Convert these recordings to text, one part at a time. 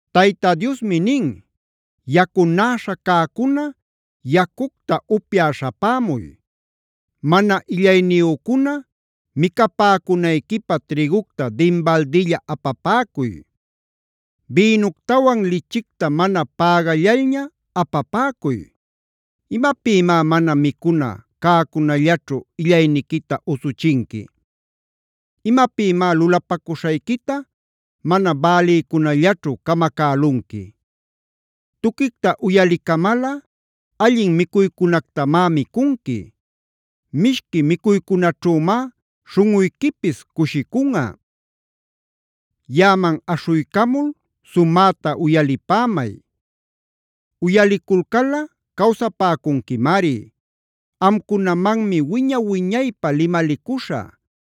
Tayta Diosmi nin: “Yacunäśha cäcuna yacucta upyä śhapämuy.a Mana illayniyücuna, micapäcunayquipä trïgucta dinbaldilla apapäcuy. Bïnuctawan lichicta mana pägallalña apapäcuy. ¿Imapïmá mana micuna cäcunallaćhu illayniquita usuchinqui? ¿Imapïmá lulapacuśhayquita mana bälïcunallaćhu camacälunqui? Tuquicta uyalicamalꞌa allin micuycunactamá micunqui; mishqui micuycunaćhümá śhunꞌuyquipis cushicunꞌa. “Yaꞌaman aśhuycamul sumäta uyalipämay; uyaliculcalꞌa cawsapäcunquimari. Amcunamanmi wiña-wiñaypä limalicuśhä;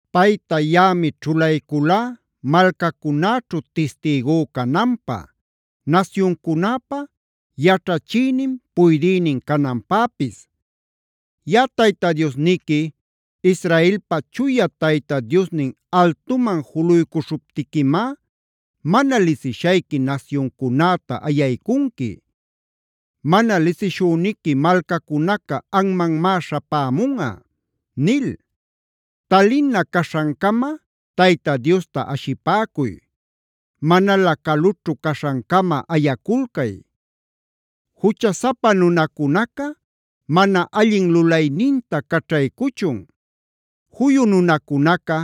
Payta yaꞌami ćhulayculá malcacunäćhu tistïgú cananpä, nasyuncunäpä yaćhachïnin, puydïnin cananpäpis. Yaꞌa Tayta Diosniqui, Israelpa Chuya Tayta Diosnin altuman juluycuśhuptiquimá mana lisishayqui nasyuncunäta ayaycunqui; mana lisishüniqui malcacunaca anmanmá śhapämunꞌa” nil. Talina caśhancama Tayta Diosta ashipäcuy; manalä calućhu caśhancama ayaculcay. Juchasapa nunacunaca mana allin lulayninta caćhaycuchun; juyu nunacunaca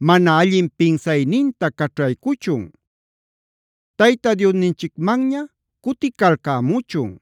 mana allin pinsayninta caćhaycuchun. Tayta Diosninchicmanña cuticalcämuchun;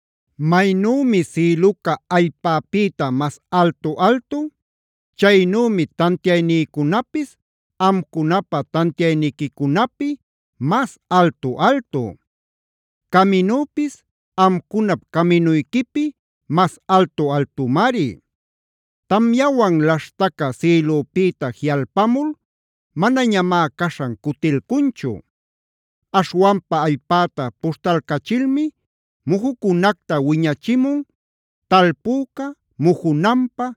Maynümi sïluca allpäpïta mas altu-altu. Chaynümi tantiaynïcunapis amcunapä tantiayniquicunapi mas altu-altu; caminüpis amcunap caminuyquipi mas altu-altumari. “Tamyawan laśhtaca sïlüpïta jiꞌalpamul manañamá caśhan cutilcunchu. Aśhwanpa allpäta puśhtalcachilmi mujucunacta wiñachimun talpüca mujunanpä,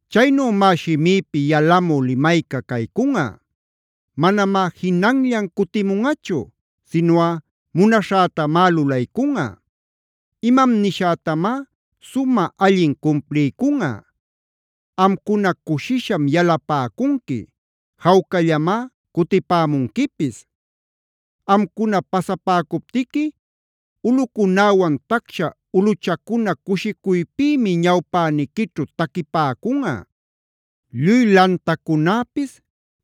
Chaynümá shimïpi yalamü limayca caycunꞌa: Manamá jinanllan cutimunꞌachu sinuꞌa munaśhätamá lulaycunꞌa; imam nishätamá sumä allin cumpliycunꞌa. Amcuna cushisham yalapäcunqui; jawcallamá cutipämunquipis. Amcuna pasapäcuptiqui ulꞌucunäwan tacsha ulꞌuchacuna cushicuypïmi ñawpäniquićhu taquipäcunꞌa; lluy lantacunäpis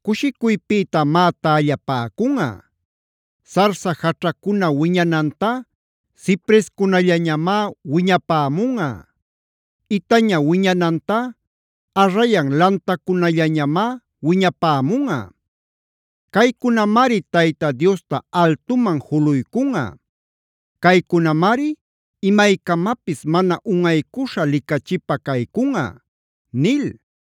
cushicuypïtamá tällapäcunꞌa. Sarsa jaćhacuna wiñanantá ciprescunallañamá wiñapämunꞌa; itaña wiñanantá arrayan lantacunallañamá wiñapämunꞌa. Caycunamari Tayta Diosta altuman juluycunꞌa; caycunamari imaycamapis mana unꞌaycuśha licachipä caycunꞌa” nil.